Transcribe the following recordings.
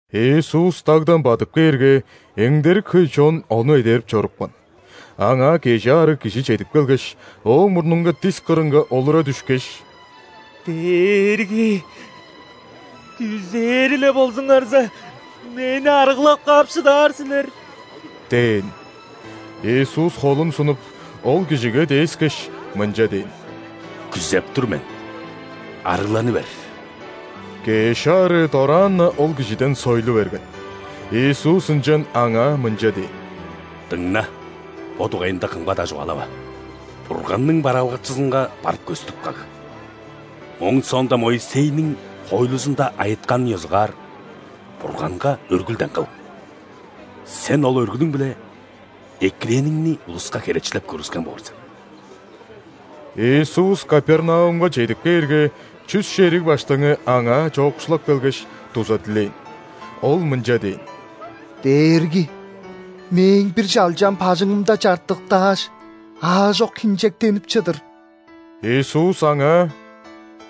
Иисус дагдан бадып кээрге, эңдерик хөй чон Ону эдерип чорупкан. Аңаа кежи аарыг кижи чедип келгеш, Ооң мурнунга дис кырынга олура дүшкеш: «Дээрги! Күзээр-ле болзуңарза, мени арыглап каап шыдаар силер» – дээн. Иисус холун сунуп, ол кижиге дээскеш, мынча дээн: «Күзеп тур мен, арыгланы бер!» Кеш аарыы дораан-на ол кижиден сойлу берген. Иисус ынчан аңаа мынча дээн: «Дыңна, бо дугайында кымга-даа чугаалава. Бурганның бараалгакчызынга барып көстүп каг. Ооң соонда Моисейниң хоойлузунда айытканын ёзугаар Бурганга өргүлден кыл. Сен ол өргүлүң-биле экирээниңни улуска херечилеп көргүскен боор сен». Иисус Капернаумга чедип кээрге, чүс шериг баштыңы Аңаа чоокшулап келгеш, дуза дилээн. Ол мынча дээн: «Дээрги, мээң бир чалчам бажыңымда чартыктааш, аажок хинчектенип чыдыр». Иисус аңаа: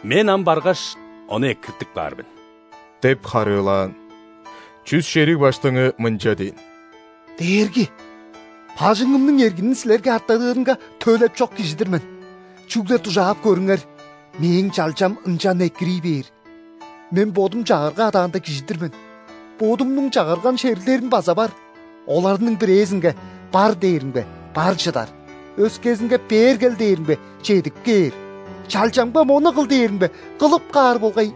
«Мен ам баргаш, ону экиртип каар мен» – деп харыылаан. Чүс шериг баштыңы мынча дээн: «Дээрги, бажыңымның эргинин Силерге артадырынга төлеп чок кижи-дир мен. Чүгле дужаап көрүңер: мээң чалчам ынчан экирий бээр. Мен бодум чагырга адаанда кижи-дир мен, бодумнуң чагырган шериглерим база бар. Оларның бирээзинге „Бар“ дээримге, бар чыдар; өскезинге „Бээр кел“ дээримге, чедип кээр; чалчамга „Мону кыл“ дээримге, кылып каар болгай».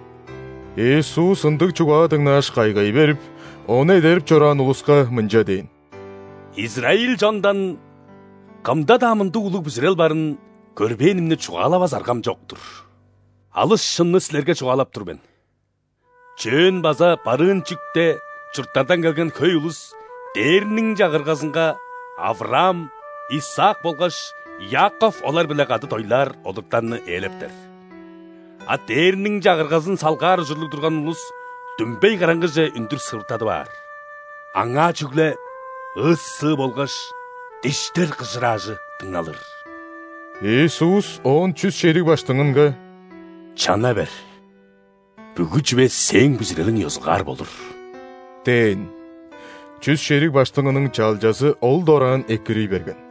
Иисус ындыг чугаа дыңнааш, кайгай берип, Ону эдерип чораан улуска мынча дээн: «Израиль чондан кымда-даа мындыг улуг бүзүрел барын көрбээнимни чугаалавас аргам чок-тур! Алыс шынны силерге чугаалап тур мен: чөөн база барыын чүкте чурттардан келген хөй улус Дээрниң Чагыргазынга Авраам, Исаак болгаш Иаков олар-биле кады дойлаар олуттарны ээлептер. А Дээрниң Чагыргазын салгаар ужурлуг турган улус дүмбей караңгыже үндүр сывыртадып аар. Аңаа чүгле ыы-сыы болгаш диштер кыжыраажы дыңналыр». Иисус оон чүс шериг баштыңынга: «Чана бер. Бүгү чүве сээң бүзүрелиң ёзугаар болур» – дээн. Чүс шериг баштыңының чалчазы ол дораан экирий берген.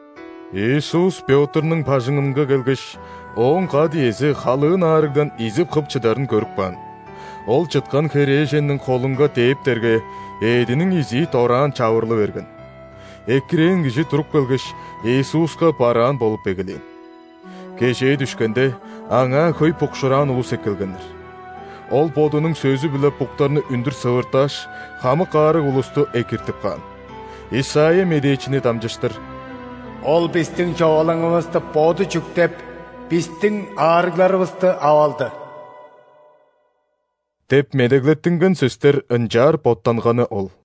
Иисус Пётрнуң бажыңынга келгеш, ооң кат-иези халыын аарыгдан изип-хып чыдарын көрүп каан. Ол чыткан херээженниң холунга дээптерге, эъдиниң изии дораан чавырлы берген. Экирээн кижи туруп келгеш, Иисуска бараан болуп эгелээн. Кежээ дүшкенде, Аңаа хөй букшуураан улус эккелгеннер. Ол Бодунуң сөзү-биле буктарны үндүр сывыртааш, хамык аарыг улусту экиртип каан. Исайя медээчини дамчыштыр: «Ол бистиң човалаңывысты Боду чүктеп, бистиң аарыгларывысты ап алды» – деп медеглеттинген сөстер ынчаар боттанганы ол.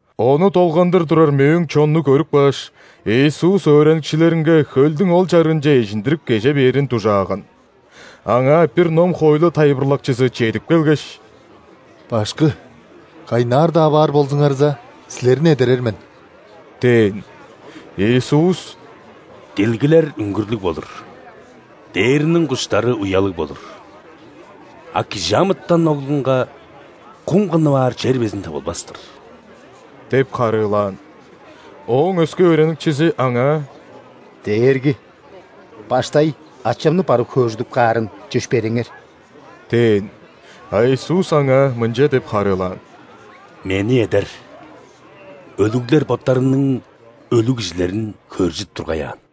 Ону долгандыр турар мөөң чонну көрүп кааш, Иисус өөреникчилеринге хөлдүң ол чарыынче эжиндирип кеже бээрин дужааган. Аңаа бир ном-хоойлу тайылбырлакчызы чедип келгеш: «Башкы, кайнаар-даа баар болзуңарза, Силерни эдерер мен» – дээн. Иисус: «Дилгилер үңгүрлүг болур, дээрниң куштары уялыг болур, а ·Кижи амытан Оглунга кум кыннып аар чер безин тывылбас-тыр» – деп харыылаан. Ооң өске өөреникчизи Аңаа: «Дээрги! Баштай ачамны барып хөөржүдүп каарын чөпшээреңер» – дээн. А Иисус аңаа мынча деп харыылаан: «Мени эдер! Өлүглер боттарының өлүг кижилерин хөөржүдүп тургай аан».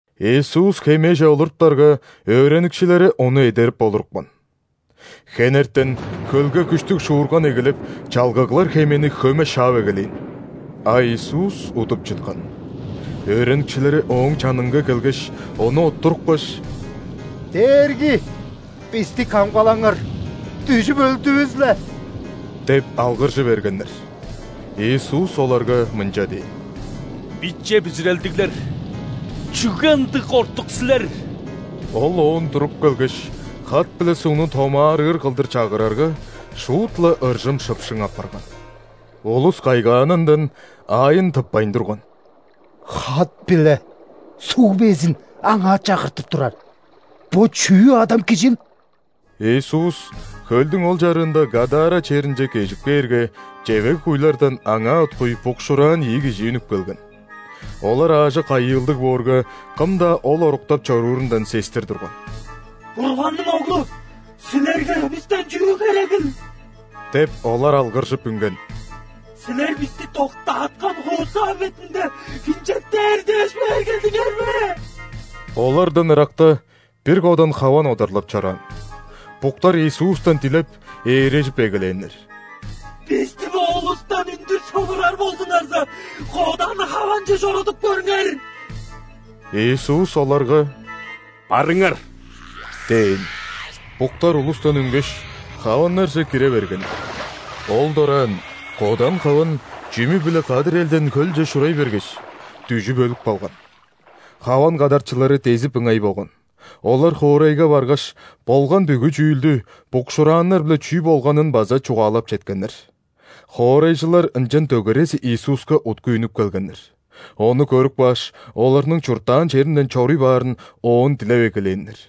Иисус хемеже олуруптарга, өөреникчилери Ону эдерип олурупкан. Хенертен хөлге күштүг шуурган эгелеп, чалгыглар хемени хөме шаап эгелээн. А Иисус удуп чыткан. Өөреникчилери Ооң чанынга келгеш, Ону оттурупкаш: «Дээрги! Бисти камгалаңар, дүжүп өлдүвүс-ле!» – деп алгыржы бергеннер. Иисус оларга мынча дээн: «Биче бүзүрелдиглер, чүге ындыг кортук силер?» Ол оон туруп келгеш, хат биле сугну томаарыыр кылдыр чагырарга, шуут-ла ыржым-шыпшың апарган. Улус кайгаанындан аайын тыппайн турган: «Хат биле суг безин Аңаа чагыртып турар, бо чүү адам Кижил?» Иисус хөлдүң ол чарыында Гадара черинче кежип кээрге, чевег-куйлардан Аңаа уткуй букшуураан ийи кижи үнүп келген. Олар аажок айыылдыг боорга, кым-даа ол оруктап чоруурундан сестир турган. «Бурганның Оглу, Силерге бистен чүү херегил? – деп, олар алгыржып үнген. – Силер бисти доктааткан хуусаа бетинде хинчектээр дээш бээр келдиңер бе?» Олардан ыракта бир кодан хаван одарлап чораан. Буктар Иисустан дилеп, ээрежип эгелээннер: «Бисти бо улустан үндүр сывырар болзуңарза, кодан хаванче чорудуп көрүңер!» Иисус оларга: «Барыңар!» – дээн. Буктар улустан үнгеш, хаваннарже кире бергеннер. Ол дораан кодан хаван чүмү-биле кадыр элден хөлче шурай бергеш, дүжүп өлүп калган. Хаван кадарчылары дезип ыңай болган. Олар хоорайга баргаш, болган бүгү чүүлдү, букшуурааннар-биле чүү болганын база, чугаалап четкеннер. Хоорайжылар ынчан дөгерези Иисуска уткуй үнүп келгеннер. Ону көрүп кааш, оларның чурттаан черинден чоруй баарын Оон дилеп эгелээннер.